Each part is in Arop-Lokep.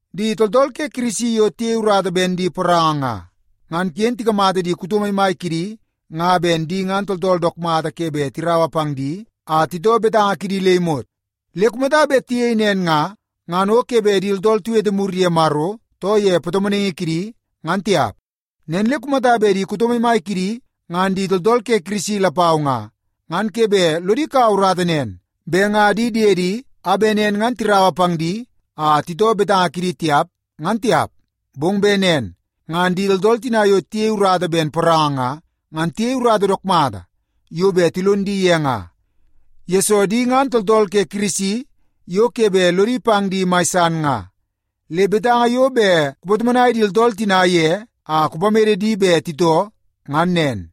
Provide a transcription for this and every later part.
Di tooltool ke Kirisi yo tiyei urata ben di poranga nga, ngan ken tikamata di kuto maimai kidi nga ben di ngan tooltool dook mata ke bet tiraua pang di a titoo betanga kidi le imot. Le kumata bet tiyei nen nga, ngan o ke bet di tooltool tiwete mur ye Maro, too ye patomonaingi kiidi, ngan tiap. Nen le kumata bet di kuto maimai kidi ngan di tooltool ke Kirisi lapau nga, ngan ke bet lodi kau urata nen bet nga di diedi a bet nen ngan tiraua pang di a titoo betanga kidi tiap, ngan tiap. Bong bet nen ngan di tooltool tina yo tiyei urata ben poranga nga, ngan tiyei urata dook mata yo bet tilon di ye nga, yesoo di ngan tooltool ke Kirisi yo ke bet lodi pang di mai san nga. Le betanga yo bet kupatomonai di tooltool tina ye a kupamede di bet titoo, ngan nen.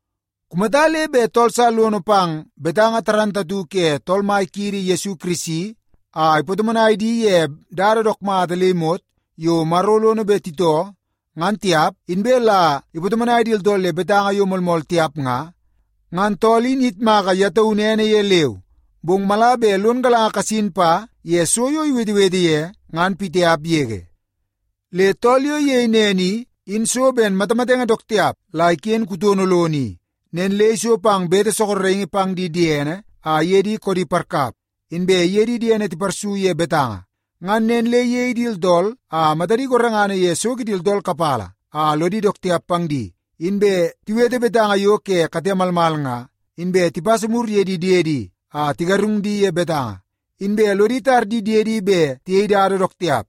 Kumata le bet tool sa lono pang betanga moolmool ke Tool Mai kiidi Yesu Kirisi a ipatomonai di ye dada dook mata le imot yo Maro lono bet titoo, ngan tiap, inbe la ipatomonai di tooltool ye betanga yo moolmool tiap nga, ngan tool in iyitmaka ye taunu ene ye leu, bong mala bet lon galanga kasin pa ye so yo iwetewete ye, ngan pitiap yege. Le tool yo iyei nen i, in so ben matamatenge dook tiap la iken kutono lono i. Nen le iso pang bete sorokingi pang di diene a iye di koodi parkap, inbe iye di diene tiparsu ye betanga. Ngan nen le iyei di tooltool a matadi gorengana ye so kidi tooltool kapala a lodi dook tiap pang di, inbe tiwete betanga yo ke kate malmal nga, inbe tipasa mur ye di diedi a tigarung di ye betanga, inbe lodi tar di diedi bet tiyei dada dook tiap,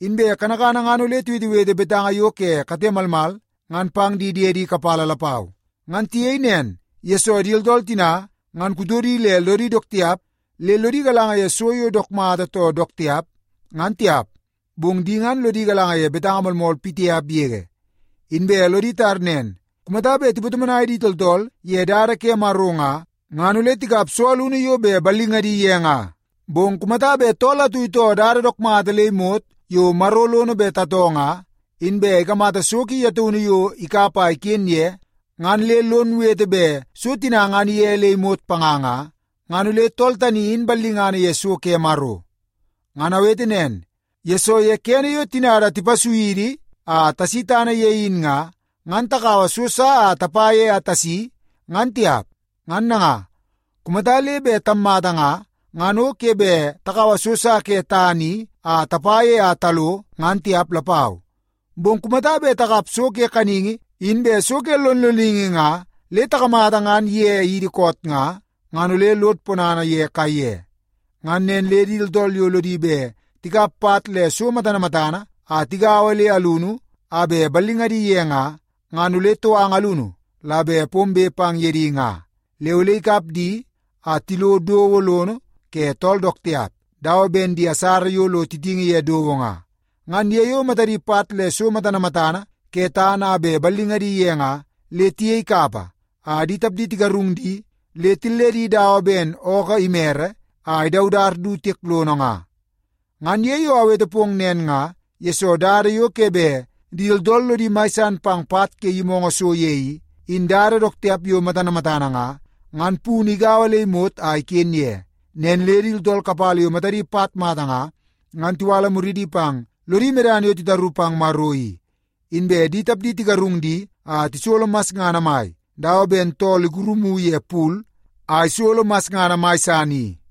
inbe kanakana ngan ole tiwetewete betanga yo ke kate malmal ngan pang di diedi kapala lapau. Ngan tiyei nen, yesoo di tooltool tina ngan kutodi le lodi dook tiap le lodi galanga ye so yo dook mata too dook tiap, ngan tiap. Bong di ngan lodi galanga ye betanga moolmool pitiap yege. Inbe lodi tar nen, kumata bet tipatomonai di tooltool ye dada ke Maro nga, ngan ole tikap so alunu yo bet ballingadi ye nga. Bong kumata bet tool atu itoo dada dook mata le imot yo Maro lono bet tatoo nga, inbe ikamata so ki ye taunu yo ikap a iken ye, ngan le lon wete bet so tina ngan ige le imot panga nga, ngan ole tool tani in ballingana ye so ke Maro. Ngan awete nen, yesoo ye kene yo tinada tipasui idi a tasi tana ye in nga, ngan takaua so sa a tapa ye a tasi, ngan tiap. Ngan nanga, kumata le bet tammata nga, ngan o ke bet takaua so sa ke tana i a tapa ye a talo ngan tiap lapau. Bong kumata bet takap so ke kaningi inbe so ke lonloningi nga le takamata ngan ige idi koot nga, ngan ole lod ponana ye kaiye. Ngan nen le di tooltool yo lodi bet tikap pat le so matana matana a tigaua le alunu a bet ballingadi ye nga, ngan ole touanga alunu la bet pombe pang ye di nga, le ole ikap di a tilo dowo lono ke tool dook tiap dawa ben di asara yo lo titingi ye dowo nga. Ngan ye yo matadi pat le so matana matana ke tana a bet ballingadi ye nga, le tiyei kapa a di tapdi tigarung di le tilledi dawa ben ookoo imere a idaudat du tiek lono nga. Ngan ye yo awete pong nen nga, yesoo dada yo ke bet di tooltool lodi mai san pang pat ke yimoongoo so ye i, in dada dook tiap yo matana matana nga, ngan punu igaua le imot a iken ye. Nen le di tooltool kapala yo matadi pat mata nga, ngan tiwala muridi pang lodi medana yo titaru pang Maro i, inbe di tapdi tigarung di a tisolo masngana mai dawa ben tool ikurumu ye pul a isolo masngana mai san i.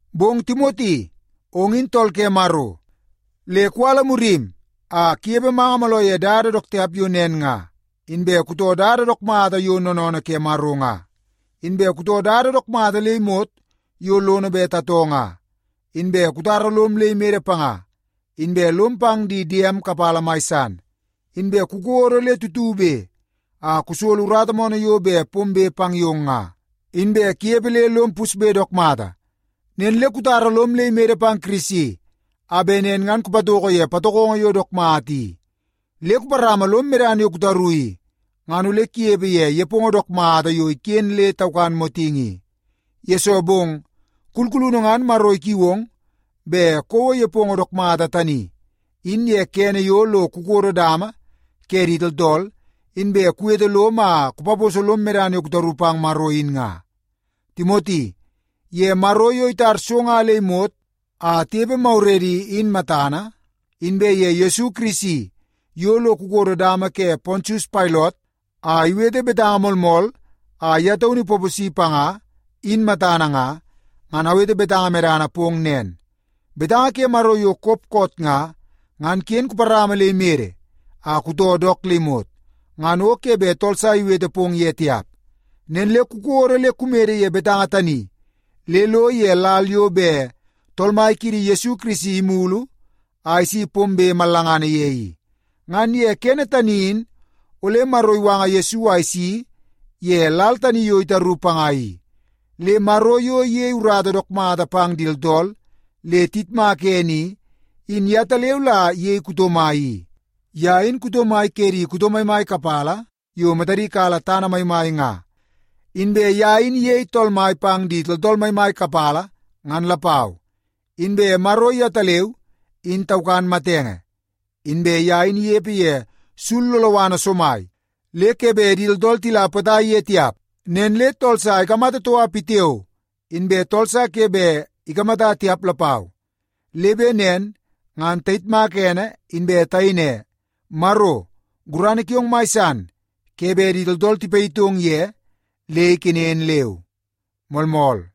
Bong Timoti, ong in tool ke Maro, le kuwala murim a kunepe manga mooloo ye dada dook tiap yo nen nga. Inbe kutoo dada dook mata yo noonoonoo ke Maro nga, inbe kutoo dada dook mata le imot yo lono bet tatoo nga, inbe kutara lom le imede panga, inbe lom pang di diem kapala mai san, inbe kukodo le tutube a kusolo urata moonoo yo bet pombe pang yong nga, inbe kunepe le lom pusbe dook mata. Nen le kutara lom le imede pang Kirisi a bet nen ngan kupatoko ye patokongo yo dook mata i. Le kuparama lom medana yo kutaru i, ngan ole kunepe ye nepongo dook mata yo iken nen le taukan motingi i. Yesoo bong, kulkulunu ngan Maro ikiu ong bet kouo nepongo dook mata tani, in ye kene yo lo kukodo dama ke di tooltool, inbe kuwete lom a kupaposo lom medana yo kutaru pang Maro in nga. Timoti, ye Maro yo itar so nga le imot a tinepe maguredi, in matana, inbe ye Yesu Kirisi yo lo ikodo dama ke Pontius Pailot a iwete betanga moolmool a ye taunu ipaposi panga, in matana nga, ngan awete betanga medana pong nen, betanga ke Maro yo kop koot nga, ngan ken kuparama le imede a kutoo dook le imot, ngan o ke bet tool sa iwete pong ye tiap. Nen le kukodo le kumede ye betanga tani le lo ye lal yo bet Tool Mai kiidi Yesu Kirisi imulu a isi pombe mallangana ye i. Ngan ye kene tani in ole Maro iwanga Yesu a isi ye lal tani yo itaru panga i. Le Maro yo iyei urata dook mata pang di tooltool le tiyitmak ene i, in yetaleu la iyei kuto mai i. Ye in kuto mai ke di kuto maimai kapala yo matadi kala tana maimai nga. Inbe ye in iyei Tool Mai pang di tooltool maimai kapala, ngan lapau. Inbe Maro yetaleu, in taukan matenge, inbe ye in inepe ye sul loloana somai le ke bet di tooltool tila potai ye tiap. Nen le tool sa ikamata toka pitiao, inbe tool sa ke bet ikamata tiap lapau. Le bet nen ngan tayitmaka ene inbe tayei ne, “Maro, gurana kiong mai san ke bet di tooltool tipayitong ye le ikenen leu.” Moolmool.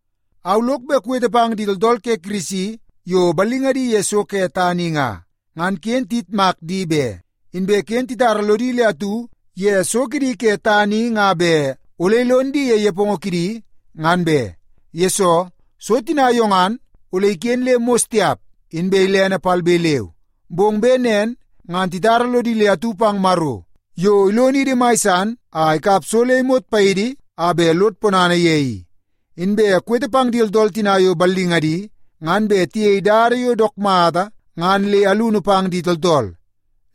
Au lok bet kuwete pang di tooltool ke Kirisi yo ballingadi ye so ke tana i nga, ngan ken tiyitmak di be. Inbe ken titara lodi le atu ye so kidi ke tana i nga bet ole ilon di ye nepongo kidi, ngan be. Yesoo, so tina yo ngan ole iken le mos tiap, inbe ilene palbe leu. Bong bet nen ngan titara lodi le atu pang Maro yo ilonidi mai san a ikap so le imot paidi a bet lod ponana ye i. Inbe kuwete pang di tooltool tina yo ballingadi ngan bet tiyei dada yo dook mata ngan le alunu pang di tooltool.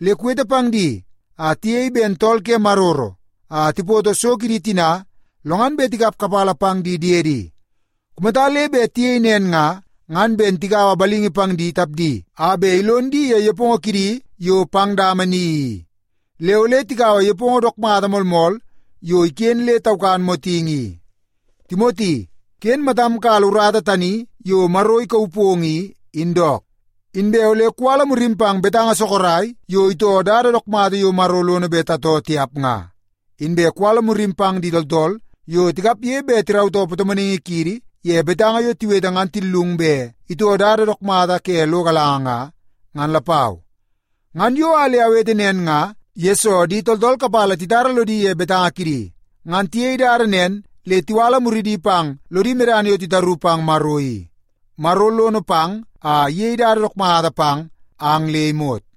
Le kuwete pang di a tiyei ben tool ke maroro a tipoto so kidi tina, lo ngan bet tikap kapala pang di diedi. Kumata le bet tiyei nen nga, ngan ben tigaua balingi pang di tapdi a bet ilon di ye nepongo kidi yo pang dama ni i. Le ole tikaua nepongo dook mata moolmool yo iken nen le taukan motingi i. Timoti, ken matam kala urata tani yo Maro ikauu pong i, in dook. Inbe ole kuwala murim pang betanga sorok yo itoo dada dook mata yo Maro lono bet tatoo tiap nga. Inbe kuwala murim pang di tooltool yo tikapge bet tirautoo patomonaingi kiidi ye betanga yo tiwete ngan tillung bet itoo dada dook mata ke lo galanga nga, ngan lapau. Ngan yo a le awete nen nga, yesoo di tooltool kapala titara lodi ye betanga kidi. Ngan tiyei dada nen le tiwala muridi pang lodi medana yo titaru pang Maro i. Maro lono pang a iyei dada dook mata pang ang le imot.